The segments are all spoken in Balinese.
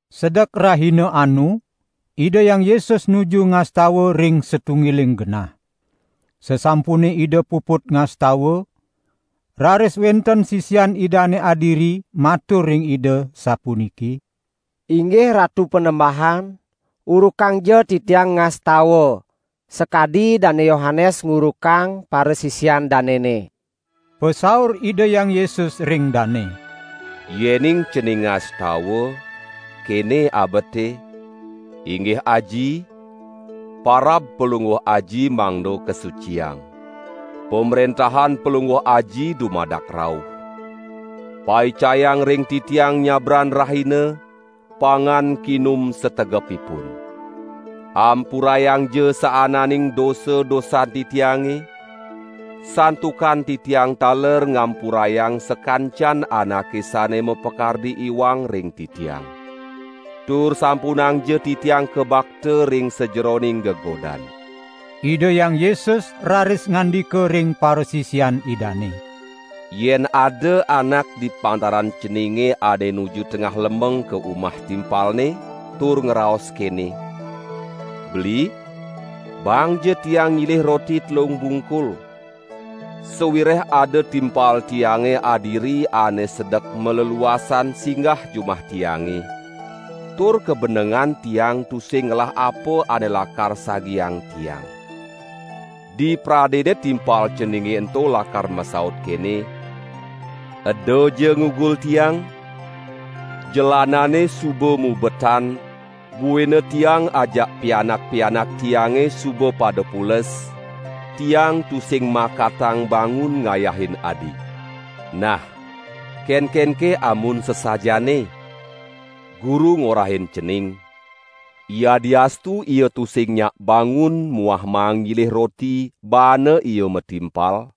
Sedek rahina anu Ida Hyang Yesus nuju ngastawa ring satunggiling genah. Sasampune Ida puput ngastawa, raris wenten sisian Idane adiri matur ring Ida sapuniki: "Inggih Ratu Panembahan, urukangja titiang ngastawa, sakadi Dane Yohanes ngurukang parasisian danene." Pasaur Ida Hyang Yesus ring dane: "Yening cening ngastawa, kene abete: Inggih Aji, parab Palungguh Aji mangda kasuciang. Pamrentahan Palungguh Aji dumadak rauh. Paicayang ring titiang nyabran rahina, pangan kinum sategepipun. Ampurayangja saananing dosa-dosan titiange, santukan titiang taler ngampurayang sakancan anake sane mapakardi iwang ring titiang. Tur sampunangja titiang kabakta ring sajeroning gegodan." Ida Hyang Yesus raris ngandika ring parasisian Idane: "Yen ada anak di pantaran ceninge ane nuju tengah lemeng ka umah timpalne tur ngraos kene: "Beli, baangja tiang nyilih roti telung bungkul, sawireh ada timpal tiange adiri ane sedek maleluasan singgah jumah tiange, tur kabenengan tiang tusing ngelah apa ane lakar sagiang tiang." Dipradene timpal ceninge ento lakar masaut kene: 'Edaja ngugul tiang, jelanane suba mubetan buina tiang ajak pianak-pianak tiange suba pada pules, tiang tusing makatang bangun ngayahin adi.' Nah kenkenke amun sasajaane? Guru ngorahin cening: Yadiastu ia tusing nyak bangun muah maang nyilih roti baana ia matimpal,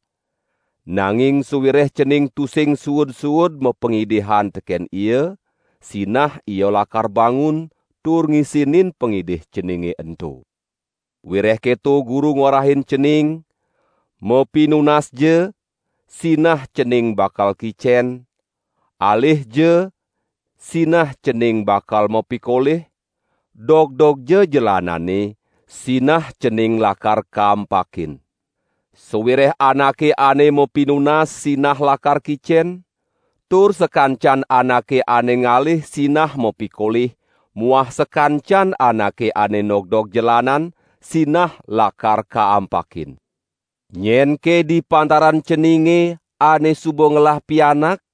nanging sawireh cening tusing suud-suud mapangidihan teken ia, sinah ia lakar bangun tur ngisinin pangidih ceninge ento. Wireh keto Guru ngorahin cening: Mapinunasja, sinah cening bakal kicen, alihja sinah cening bakal mapikolih, dogdogja jelanane, sinah cening lakar kaampakin. Sawireh anake ane mapinunas sinah lakar kicen, tur sakancan anake ane ngalih sinah mapikolih muah sakancan anake ane nogdog jelanan, sinah lakar kaampakin. Nyenke di pantaran ceninge ane suba ngelah pianak,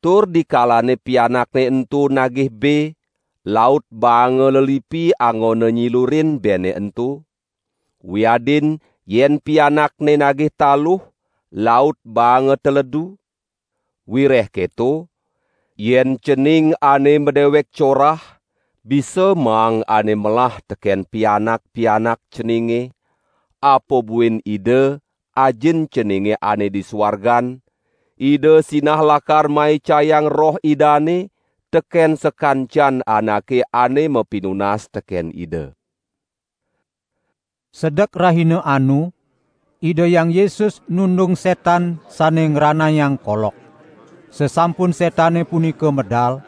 tur di kalane pianakne ento nagih be, laut baanga lelipi anggona nyilurin bene ento? Wiadin yen pianakne nagih taluh, laut baanga teledu? Wireh keto, yen cening ane madewek corah bisa maang ane melah teken pianak-pianak ceninge, apa buin Ida, Ajin ceninge ane di suargan, Ida sinah lakar maicayang Roh Idane teken sakancan anake ane mapinunas teken Ida!" Sedek rahina anu Ida Hyang Yesus nundung setan sane ngranayang kolok. Sasampun setane punika medal,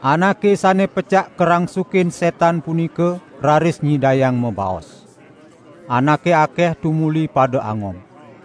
anake sane pecak karangsukin setan punika raris nyidayang mabaos. Anake akeh tumuli pada angob.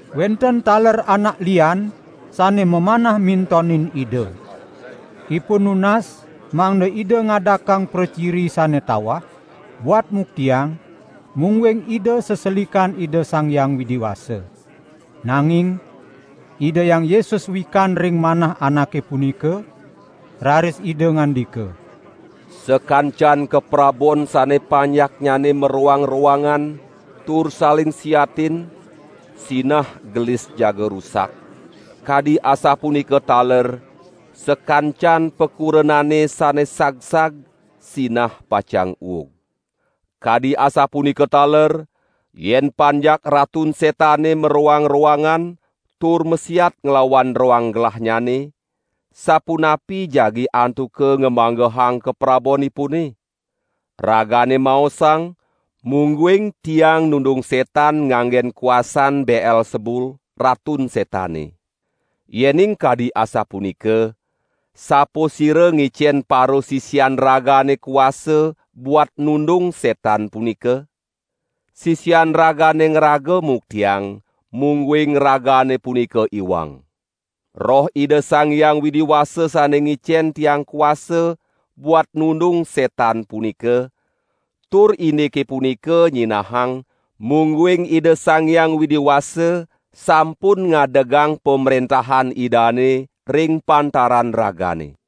Wenten taler anak lian sane mamanah mintonin Ida. Ipun nunas mangda Ida ngadakang praciri sane tawah, buat muktiang, mungguing Ida seselikan Ida Sang Hyang Widi Wasa. Nanging Ida Hyang Yesus wikan ring manah anake punika, raris Ida ngandika: "Sakancan kaprabon sane panjaknyane maroang-roangan tur saling siatin sinah gelis jaga rusak; kadi asapunika taler sakancan pakurenane sane sagsag sinah pacang uug. Kadi asapunika taler, yen panjak Ratun Setane maroang-roangan, tur masiat nglawan roang gelahnyane, sapunapi jagi antuka ngamanggehang kaprabonipune? Ragane maosang, mungguing Tiang nundung setan nganggen kuasan Beelsebul, Ratun Setane. Yening kadi asapunika, sapasira ngicen parasisian ragane kuasa buat nundung setan punika? Sisian ragane ngraga muktiang, mungguing ragane punika iwang. Roh Ida Sang Hyang Widi Wasa sane ngicen Tiang kuasa buat nundung setan punika, tur indike punika nyinahang, mungguing Ida Sang Hyang Widi Wasa sampun ngadegang Pamrentahan Idane ring pantaran ragane.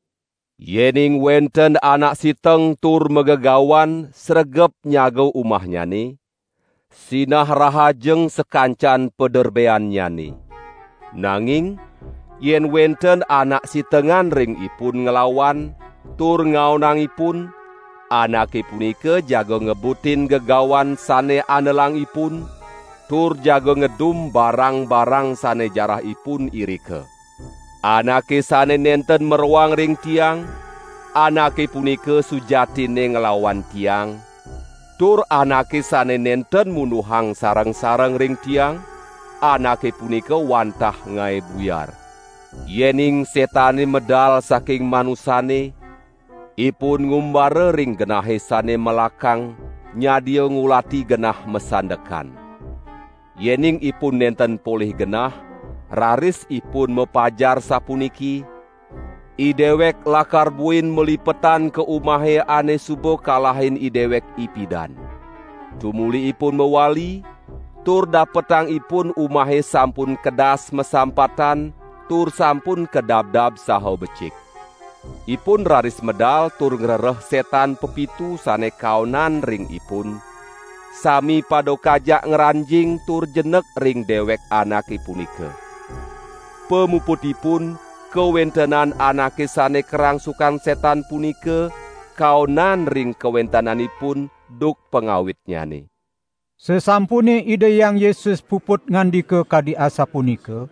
Yening wenten anak siteng tur magegawan sregep nyaga umahnyane, sinah rahajeng sakancan paderbeannyane. Nanging yen wenten anak sitengan ring ipun nglawan tur ngaonang ipun, anake punika jaga ngebutin gegawan sane andelang ipun, tur jaga ngedum barang-barang sane jarah ipun irika. Anake sane nenten maroang ring Tiang, anake punika sujatinne nglawan Tiang, tur anake sane nenten munduhang sareng-sareng ring Tiang, anake punika wantah ngae buyar." "Yening setane medal saking manusane, ipun ngumbara ring genahe sane melakang nyadia ngulati genah masandekan. Yening ipun nenten polih genah, raris ipun mapajar sapuniki: 'Idewek lakar buin malipetan ka umahe ane suba kalahin idewek ipidan.' Tumuli ipun mawali, tur dapetang ipun umahe sampun kedas masampatan tur sampun kadabdab saha becik. Ipun raris medal tur ngrereh setan pepitu sane kaonan ring ipun, sami pada kajak ngranjing tur jenek ring dewek anake punika. Pamuputipun kawentenan anake sane karangsukan setan punika, kaonan ring kawentenanipun duk pangawitnyane." Sasampune Ida Hyang Yesus puput ngandika kadi asapunika,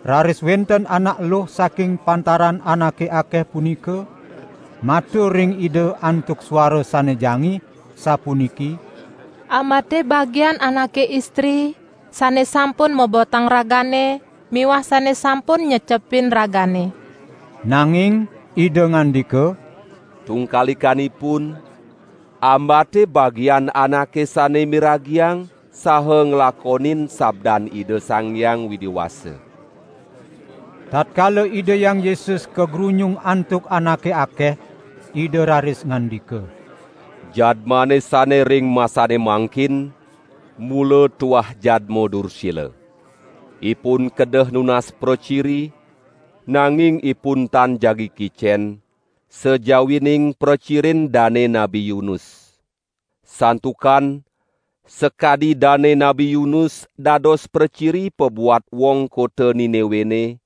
raris wenten anak eluh saking pantaran anake akeh punika, matur ring Ida antuk suara sane jangih, sapuniki: "Ambate bagian anake istri, sane sampun mobotang Ragane miwah sane sampun nyecepin Ragane." Nanging Ida ngandika: "Tungkalikanipun, ambate bagian anake sane miragiang saha nglakonin sabdan Ida Sang Hyang Widi Wasa." Tatkala Ida Hyang Yesus kagrunyung antuk anake akeh, Ida raris ngandika: "Jadmane sane ring masane mangkin, mula tuah jadma dursila. Ipun kedeh nunas praciri, nanging ipun tan jagi kicen, sajawining pracirin dane Nabi Yunus. Santukan, sakadi dane Nabi Yunus dados praciri pabuat wong kota Niniwene,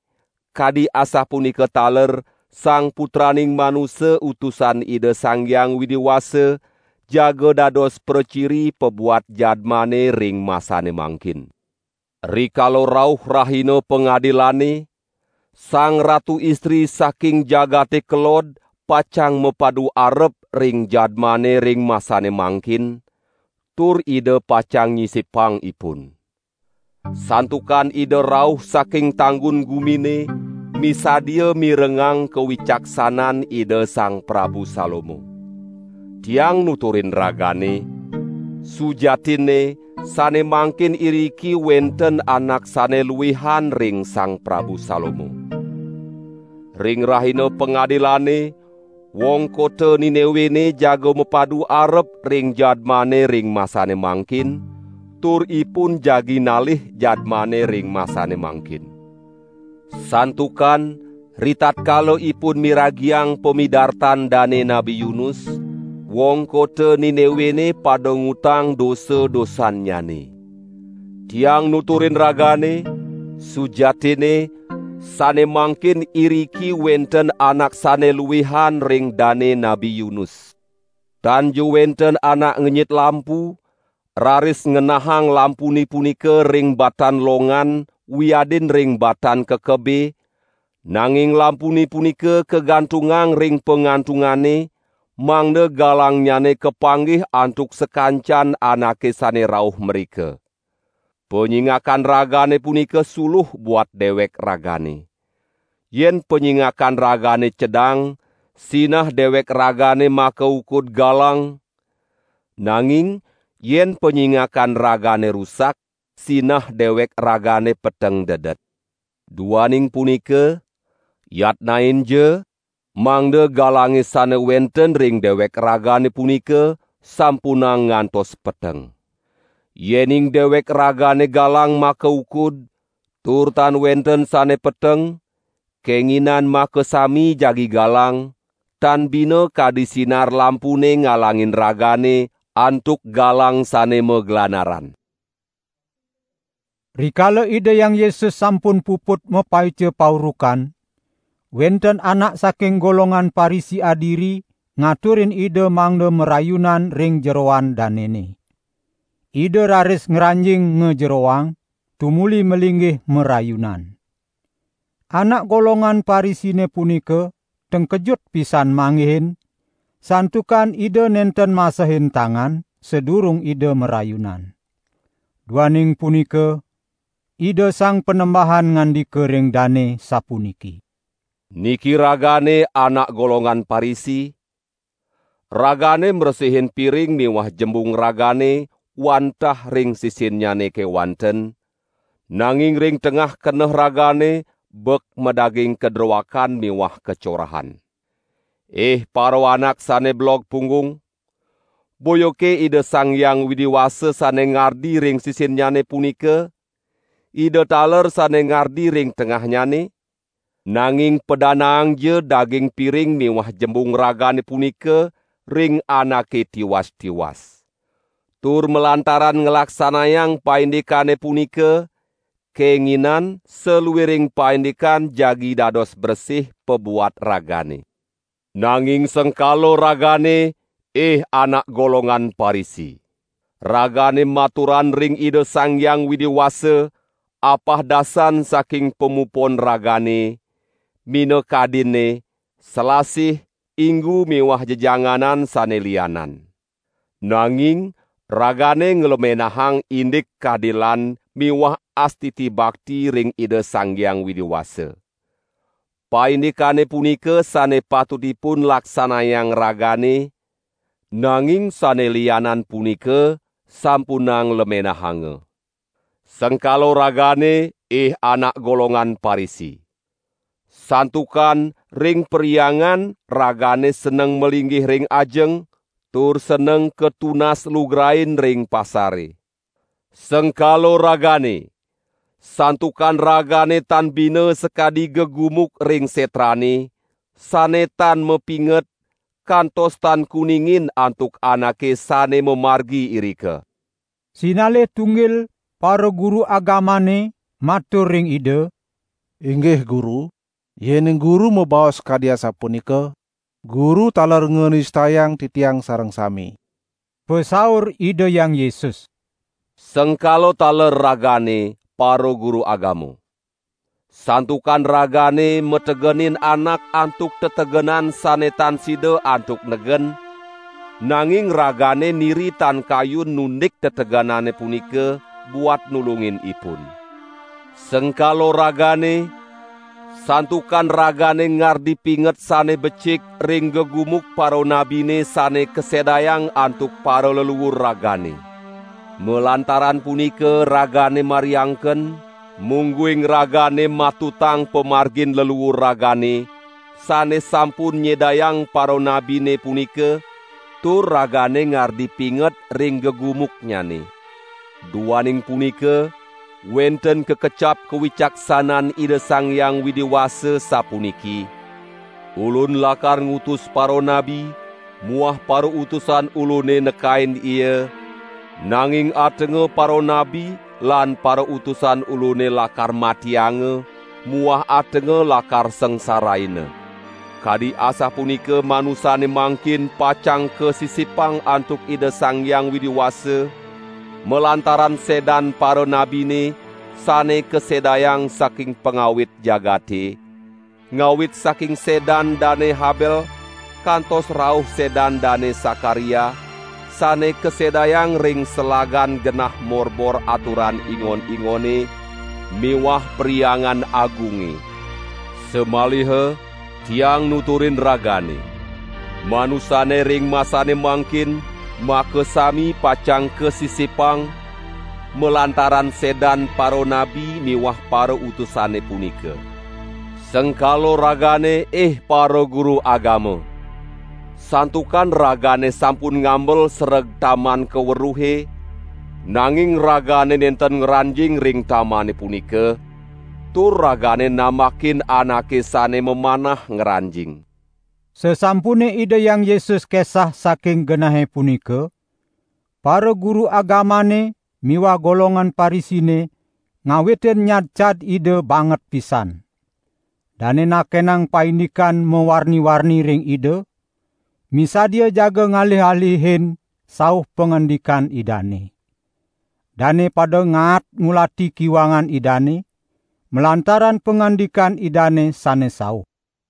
kadi asapunika taler Sang Putraning Manusa Utusan Ida Sang Hyang Widi Wasa, jaga dados praciri pabuat jadmane ring masane mangkin. Rikala rauh Rahina Pangadilane, Sang Ratu Istri saking jagate kelod pacang mapadu arep ring jadmane ring masane mangkin, tur ida pacang nyisipang ipun. Santukan ida rauh saking tanggun gumine misadia mirengang kawicaksanan Ida Sang Prabu Salomo. Tiang nuturin ragane, sujatinne sane mangkin iriki wenten anak sane luihan ring Sang Prabu Salomo. Ring Rahina Pangadilane, wong kota Niniwene jaga mapadu arep ring jadmane ring masane mangkin, tur ipun jagi nalih jadmane ring masane mangkin. Santukan ritatkala ipun miragiang pamidartan dane Nabi Yunus, wong kota Niniwene pada ngutang dosa-dosannyane. Tiang nuturin ragane, sujatinne sane mangkin iriki wenten anak sane luihan ring dane Nabi Yunus!" "Tanja wenten anak ngenyit lampu, raris ngenahang lampune punika ring batan longan wiadin ring batan kekebe, nanging lampune punika kagantungang ring pangantungane, mangda galangnyane kapanggih antuk sakancan anake sane rauh mrika. Panyingakan ragane punika suluh buat dewek ragane. Yen panyingakan ragane cedang, sinah dewek ragane makaukud galang, nanging yen panyingakan ragane rusak, sinah dewek ragane peteng dedet. Duaning punika, yatnainja mangda galange sane wenten ring dewek ragane punika sampunang ngantos peteng. Yening dewek ragane galang makaukud, tur tan wenten sane peteng, kenginan makasami jagi galang, tan bina kadi sinar lampune ngalangin ragane antuk galang sane maglanaran." Rikala Ida Hyang Yesus sampun puput mapaica paurukan, wenten anak saking golongan Parisi adiri ngaturin Ida mangda marayunan ring jeroan danene. Ida raris ngranjing ngajeroang tumuli malinggih marayunan. Anak golongan Parisine punika tengkejut pisan manggihin, santukan Ida nenten masehin tangan, sadurung Ida marayunan. Duaning punika, Ida Sang Panembahan ngandika ring dane, sapuniki: "Niki ragane anak golongan Parisi, ragane mresihin piring miwah jembung ragane wantah ring sisinnyane kewanten, nanging ring tengah keneh ragane bek madaging kadroakan miwah kacorahan. Ih paraanak sane belog punggung, boyake Ida Sang Hyang Widi Wasa sane ngardi ring sisinnyane punika, Ida taler sane ngardi ring tengahnyane? Nanging padanaangja daging piring miwah jembung ragane punika ring anake tiwas-tiwas. Tur malantaran nglaksanayang paindikane punika, kenginan saluiring paindikan jagi dados bresih pabuat ragane. Nanging sengkala ragane ih anak golongan Parisi. Ragane maturan ring Ida Sang Hyang Widi Wasa, apahdasan saking pamupon ragane, minakadinne: selasih, inggu miwah jejanganan sane lianan. Nanging ragane nglemenahan indik kadilan miwah astiti bakti ring Ida Sang Hyang Widi Wasa. Paindikane punika sane patutipun laksanayang ragane, nanging sane lianan punika sampunang lemenahanga. Sengkala ragane ih anak golongan Parisi. Santukan ring perhyangan ragane seneng malinggih ring ajeng, tur seneng katunas lugrain ring pasare. Sengkala ragane, santukan ragane tan bina sakadi gegumuk ring setrane, sane tan mapinget, kantos tan kuningin antuk anake sane mamargi irika." Sinalih tunggil paraguru agamane matur ring Ida: "Inggih Guru, yening Guru mabaos kadi asapunika, Guru taler nganistayang titiang sareng sami!" Pasaur Ida Hyang Yesus: "Sengkala taler ragane paraguru agama! Santukan ragane mategenin anak antuk tetegenan sane tan sida antuk negen, nanging ragane niri tan kayun nundik tetegenane punika, buat nulungin ipun. Sengkala ragane, santukan ragane ngardi pinget sane becik ring gegumuk paranabine sane kasedayang antuk paraleluur ragane. Malantaran punika ragane mariangken, mungguing ragane matutang pamargin leluur ragane, sane sampun nyedayang paranabine punika, tur ragane ngardi pinget ring gegumuknyane. Duaning punika wenten kakecap kawicaksanan Ida Sang Hyang Widi Wasa sapuniki: 'Ulun lakar ngutus paranabi muah parautusan Ulune nekain ia, nanging atenga paranabi lan parautusan Ulune lakar matianga muah atenga lakar sangsaraina.' Kadi asapunika manusane mangkin pacang kasisipang antuk Ida Sang Hyang Widi Wasa, malantaran sedan paranabine sane kasedayang saking pangawit jagate, ngawit saking sedan Dane Habel kantos rauh sedan Dane Sakaria, sane kasedayang ring selagan genah morbor aturan ingon-ingone miwah Perhyangan Agunge. Samaliha Tiang nuturin ragane: Manusane ring masane mangkin makasami pacang kasisipang malantaran sedan paranabi miwah parautusane punika. Sengkala ragane ih paraguru agama, santukan ragane sampun ngambel sereg taman kaweruhe, nanging ragane nenten ngranjing ring tamane punika, tur ragane nambakin anake sane mamanah ngranjing!" Sasampune Ida Hyang Yesus kesah saking genahe punika, paraguru agamane miwah golongan Parisine ngawitin nyadcad Ida banget pisan. Dane nakenang paindikan mawarni-warni ring Ida, misadia jaga ngalih-ngalihin sauh pangandikan Idane. Dane pada ngaat ngulati kiwangan Idane, malantaran pangandikan Idane sane sauh.